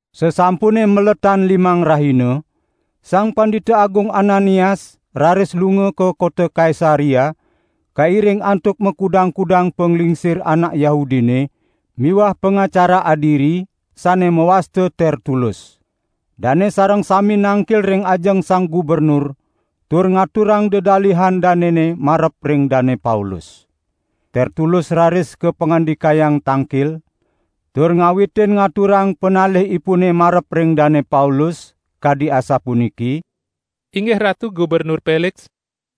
Sasampune maletan limang rahina, Sang Pandita Agung Ananias raris lunga ka kota Kaisarea kairing antuk makudang-kudang panglingsir anak Yahudine miwah pangacara adiri, sane mawasta Tertulus. Dane sareng sami nangkil ring ajeng sang gubernur tur ngaturang dedalihan danene marep ring Dane Paulus. Tertulus raris kapangandikayang tangkil, tur ngawitin ngaturang panalihipune marep ring Dane Paulus, kadi asapuniki: "Inggih Ratu Gubernur Peliks,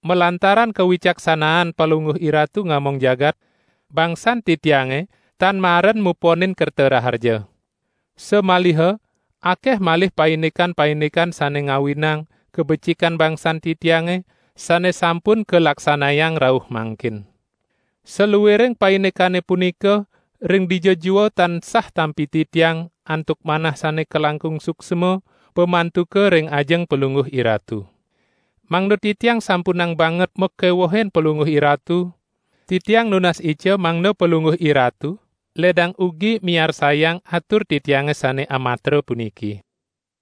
malantaran kawicaksanaan palungguh iratu ngamong jagat, bangsan titiange tan maren muponin kerta raharja. Samaliha akeh malih paindikan-paindikan sane ngawinang kabecikan bangsan titiange sane sampun kalaksanayang rauh mangkin. Saluiring paindikane punika ring dija jua tansah tampi titiang antuk manah sane kalangkung suksma pamantuka ring ajeng palungguh iratu. Mangda titiang sampunang banget makewuhin palungguh iratu, titiang nunas ica mangda palungguh iratu ledang ugi miarsayang atur titiange sane amatra puniki.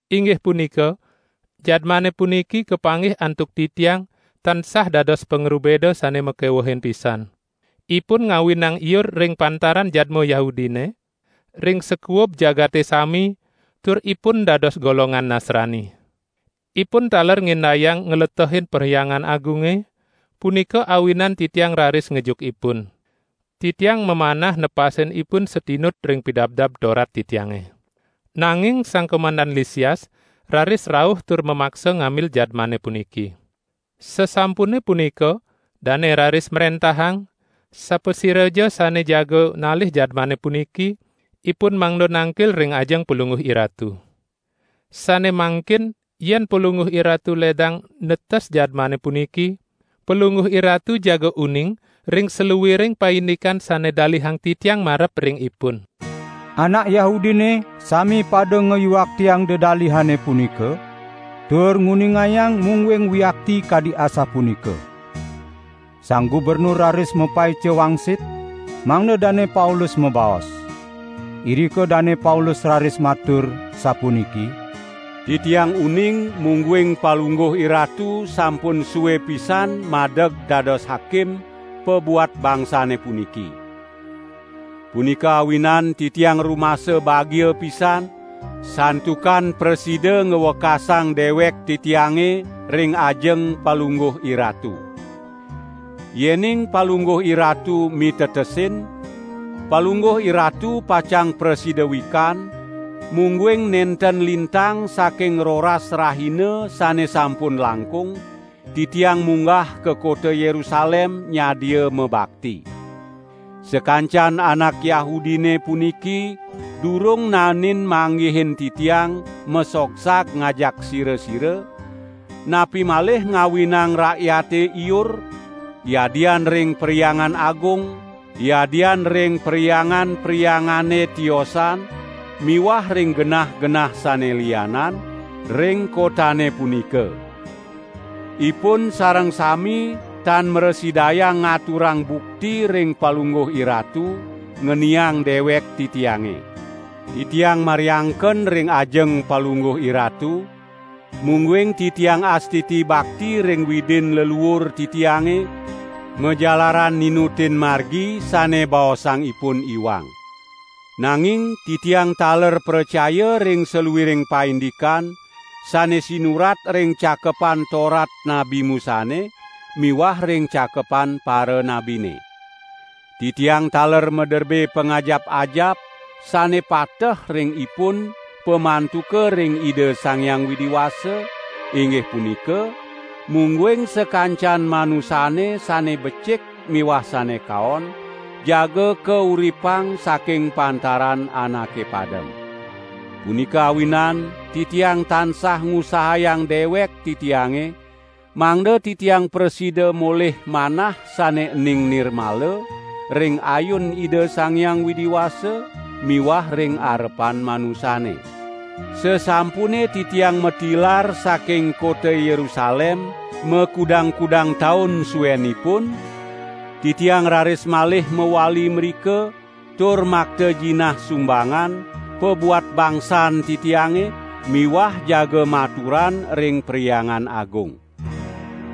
Inggih punika, jadmane puniki kapanggih antuk titiang tansah dados pangrubeda sane makewehin pisan. Ipun ngawinang iur ring pantaran jadma Yahudine, ring sakuub jagate sami, tur ipun dados golongan Nasrani. Ipun taler ngindayang ngletehin Perhyangan Agunge, punika awinan titiang raris ngejuk ipun. [Titiang mamanah nepasin ipun satinut ring Pidabdab Torat titiange. Nanging Sang Komandan Lisias raris rauh tur mamaksa ngambil jadmane puniki. Sasampune punika dane raris mrentahang, sapasiraja sane jaga nalih jadmane puniki, ipun mangda nangkil ring ajeng palungguh iratu.] Sane mangkin yen palungguh iratu ledang netes jadmane puniki, palungguh iratu jaga uning ring saluiring paindikan sane dalihang titiang marep ring ipun." Anak Yahudine sami pada ngawiaktiang dedalihane punika, tur nguningayang mungguing wiakti kadi asapunika. Sang gubernur raris mapaica wangsit mangda Dane Paulus mabaos. Irika Dane Paulus raris matur, sapuniki: "Titiang uning mungguing palungguh iratu sampun sue pisan madeg dados hakim pabuat bangsane puniki. Punika awinan titiang rumasa bagia pisan santukan prasida ngwekasang dewek titiange ring ajeng palungguh iratu. Yening palungguh iratu mitetesin, palungguh iratu pacang prasida wikan, mungguing nenten lintang saking roras rahina sane sampun langkung, titiang munggah ka kota Yerusalem nyadia mabakti. Sakancan anak Yahudine puniki durung naenin manggihin titiang masogsag ngajak sira-sira, napi malih ngawinang rakyate iur, yadian ring Perhyangan Agung, yadian ring perhyangan-perhyangane tiosan miwah ring genah-genah sane lianan, ring kotane punika. Ipun sareng sami tan mrasidayang ngaturang bukti ring palungguh iratu, ngeniang dewek titiange. Titiang mariangken ring ajeng palungguh iratu, mungguing titiang astiti bakti ring Widin leluur titiange, majalaran ninutin Margi sane baosang ipun iwang. Nanging titiang taler pracaya ring saluiring paindikan sane sinurat ring Cakepan Torat Nabi Musane miwah ring Cakepan Paranabine. Titiang taler maderbe pangajap-ajap sane pateh ring ipun pamantuka ring Ida Sang Hyang Widi Wasa, inggih punika, mungguing sakancan manusane sane becik miwah sane kaon, jaga kauripang saking pantaran anake padem. Punika awinan titiang tansah ngusahayang dewek titiange mangda titiang prasida molih manah sane ening nirmala ring ayun Ida Sang Hyang Widi Wasa miwah ring arepan manusane. Sasampune titiang matilar saking kota Yerusalem makudang-kudang taun suenipun, titiang raris malih mawali mrika tur makta jinah sumbangan pabuat bangsan titiange miwah jaga maturan ring Perhyangan Agung.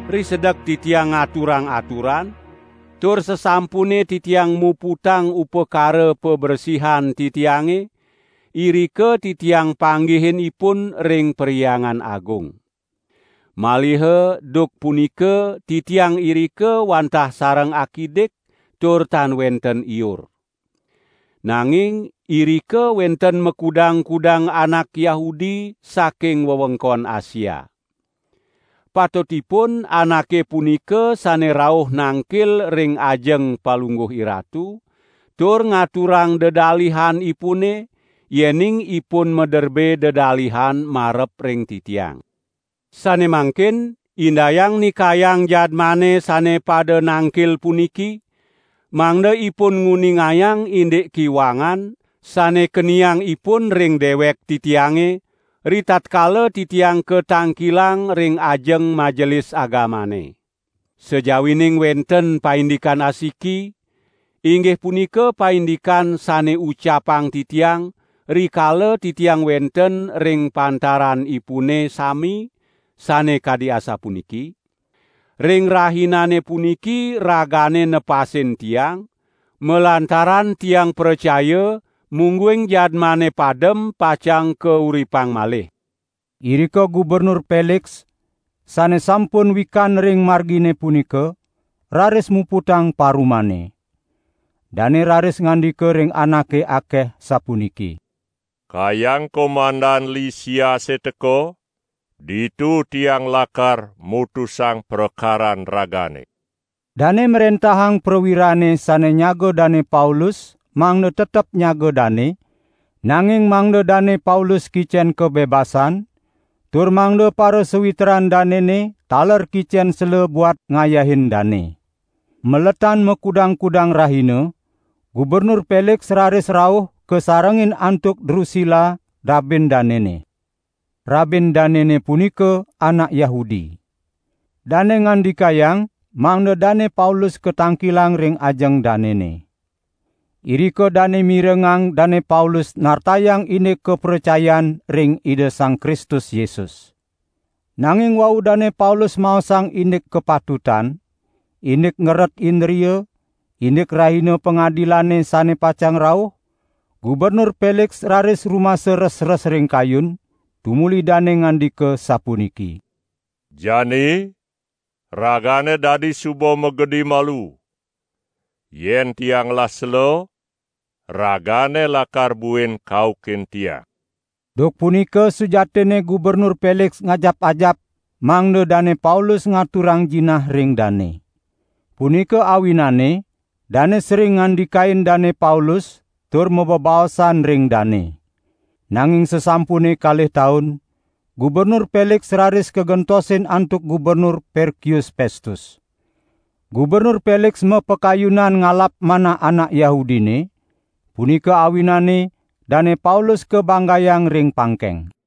Risedek titiang ngaturang aturan, tur sasampune titiang muputang upakara pabresihan titiange, irika titiang panggihin ipun ring Perhyangan Agung. Maliha duk punika titiang irika wantah sareng akidik tur tan wenten iur. Nanging irika wenten makudang-kudang anak Yahudi saking wewengkon Asia. Patutipun anake punika sane rauh nangkil ring ajeng palungguh iratu, tur ngaturang dedalihanipune, yening ipun maderbe dedalihan marep ring titiang. Sane mangkin indayang nikayang jadmane sane pada nangkil puniki, mangda ipun nguningayang indik kiwangan sane keniang ipun ring dewek titiange, ritatkala titiang katangkilang ring ajeng Majelis Agamane. Sajawining wenten paindikan asiki, inggih punika paindikan sane ucapang titiang rikala titiang wenten ring pantaranipune sami, sane kadi asapuniki: 'Ring rahinane puniki ragane nepasin tiang, malantaran tiang pracaya mungguing jadmane padem pacang kauripang malih.' " Irika Gubernur Peliks, sane sampun wikan ring Margine punika, raris muputang parumane. Dane raris ngandika ring anake akeh sapuniki: "Kayang Komandan Lisiase teka, ditu tiang lakar mutusang prakaran ragane." Dane mrentahang prawirane sane nyaga Dane Paulus mangda tetep nyaga dane, nanging mangda Dane Paulus kicen kabebasan, tur mangda parasawitran danene taler kicen sela buat ngayahin dane. Maletan makudang-kudang rahina, Gubernur Peliks raris rauh kasarengin antuk Drusila rabin danene. Rabin danene punika anak Yahudi. Dane ngandikayang mangda Dane Paulus katangkilang ring ajeng danene. Irika dane mirengang Dane Paulus nartayang indik kapracayan ring Ida Sang Kristus Yesus. Nanging wau Dane Paulus maosang indik kapatutan, indik ngeret indria, indik Rahina Pangadilane sane pacang rauh, Gubernur Peliks raris rumasa resres ring kayun, tumuli dane ngandika sapuniki: "Jani ragane dadi suba magedi malu. Yen tiang ngelah sela, ragane lakar buin kaukin tiang." Duk punika sujatinne Gubernur Peliks ngajap-ajap mangda Dane Paulus ngaturang jinah ring dane. Punika awinane dane sering ngandikain Dane Paulus tur mabebaosan ring dane. Nanging sasampune kalih taun, Gubernur Peliks raris kagentosin antuk Gubernur Perkius Pestus. Gubernur Peliks mapakayunan ngalap manah anak Yahudine, punika awinane Dane Paulus kabanggayang ring pangkeng.